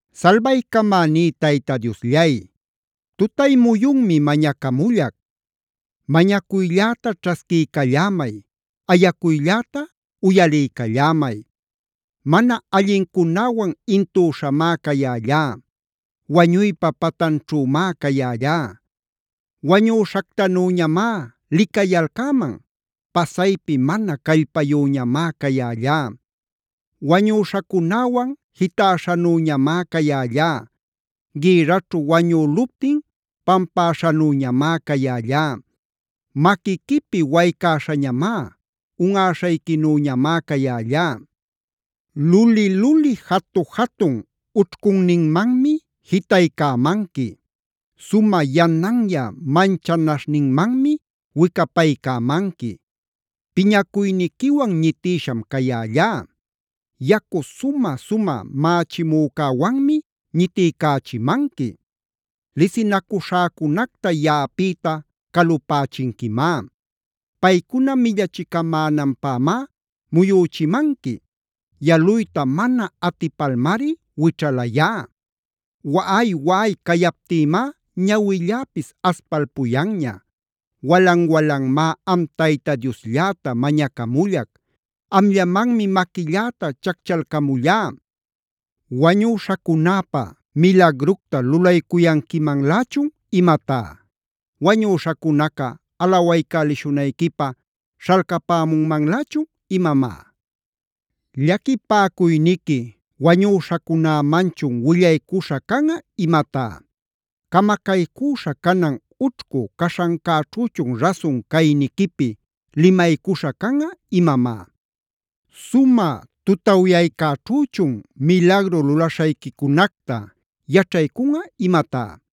Salbaycamäní Tayta Diosllay, tutay muyunmi mañacamullac. Mañacuylläta ćhasquiycallämay. Ayacuylläta uyaliycallämay. Mana allincunäwan intüśhamá cayällá. Wañuypa patanćhümá cayällá. Wañüśhactanüñamá licayalcäman. Pasaypi mana callpayüñamá cayällá. Wañüśhacunäwan jitäśhanüñamá cayällá. Gïrraćhu wañüluptin pampäśhanüñamá cayällá. Maquiquipi waycäśhañamá, unꞌäśhayquinüñamá cayällá. Luli-luli jatu-jatun ućhcunninmanmi jitaycämanqui. Sumä yananyä manchanaśhninmanmi wicapaycämanqui. Piñacuyniquiwan ñitïsham cayällá. Yacu sumä-sumä mächimücäwanmi ñitiycächimanqui. Lisinacuśhäcunacta yaꞌapïta calupächinquimá. Paycuna millachicamänanpämá muyüchimanqui. Yaluyta mana atipalmari wićhalayá. Waꞌay-waꞌay cayaptïmá ñawilläpis aspalpuyanña. Walan-walanmá am Tayta Dioslläta mañacamullac. Amllamanmi maquilläta chacchalcamullá. ¿Wañüśhacunäpa milagructa lulaycuyanquimanlächun imatá? ¿Wañüśhacunaca alawaycälishunayquipä śhalcapämunmanlächun imamá? ¿Llaquipäcuyniqui wañüśhacunämanchun willaycuśha canꞌa imatá? ¿Camacaycüśha canan ućhcu caśhancäćhüchun rasun cayniquipi limaycuśha canꞌa imamá? ¿Sumä tutawyaycäćhüchun milagru lulaśhayquicunacta yaćhaycunꞌa imatá?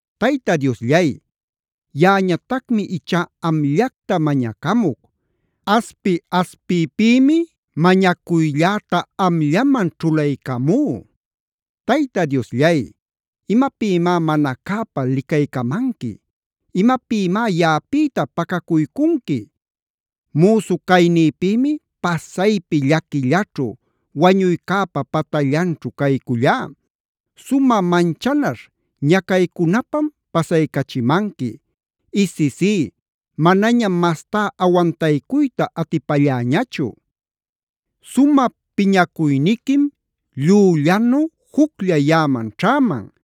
Tayta Diosllay, yaꞌañatacmi ichá amllacta mañacamuc. Aspi-aspiypïmi mañacuylläta amllaman ćhulaycamú. Tayta Diosllay, ¿imapïmá mana cäpa licaycamanqui? ¿Imapïmá yaꞌapïta pacacuycunqui? Müsu caynïpïmi pasaypi llaquillaćhu, wañuycäpa patallanćhu caycullá. Sumä manchanaśh ñacaycunapam pasaycachimanqui. Isisí, manañam mastá awantaycuyta atipälläñachu. Sumä piñacuyniquim llüllanu juclla yaꞌaman ćhäman.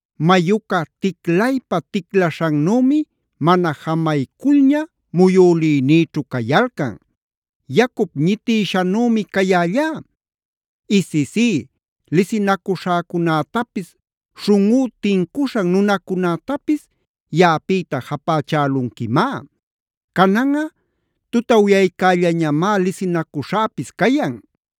Mayuca ticlaypa-ticlaśhannümi mana jamayculña muyülïnïćhu cayalcan. Yacup ñitïshanümi cayällá. Isisí, lisinacuśhäcunätapis, śhunꞌú tincuśhan nunacunätapis yaꞌapïta japächälunquimá. Cananꞌa tutawyaycällañamá lisinacuśhäpis cayan.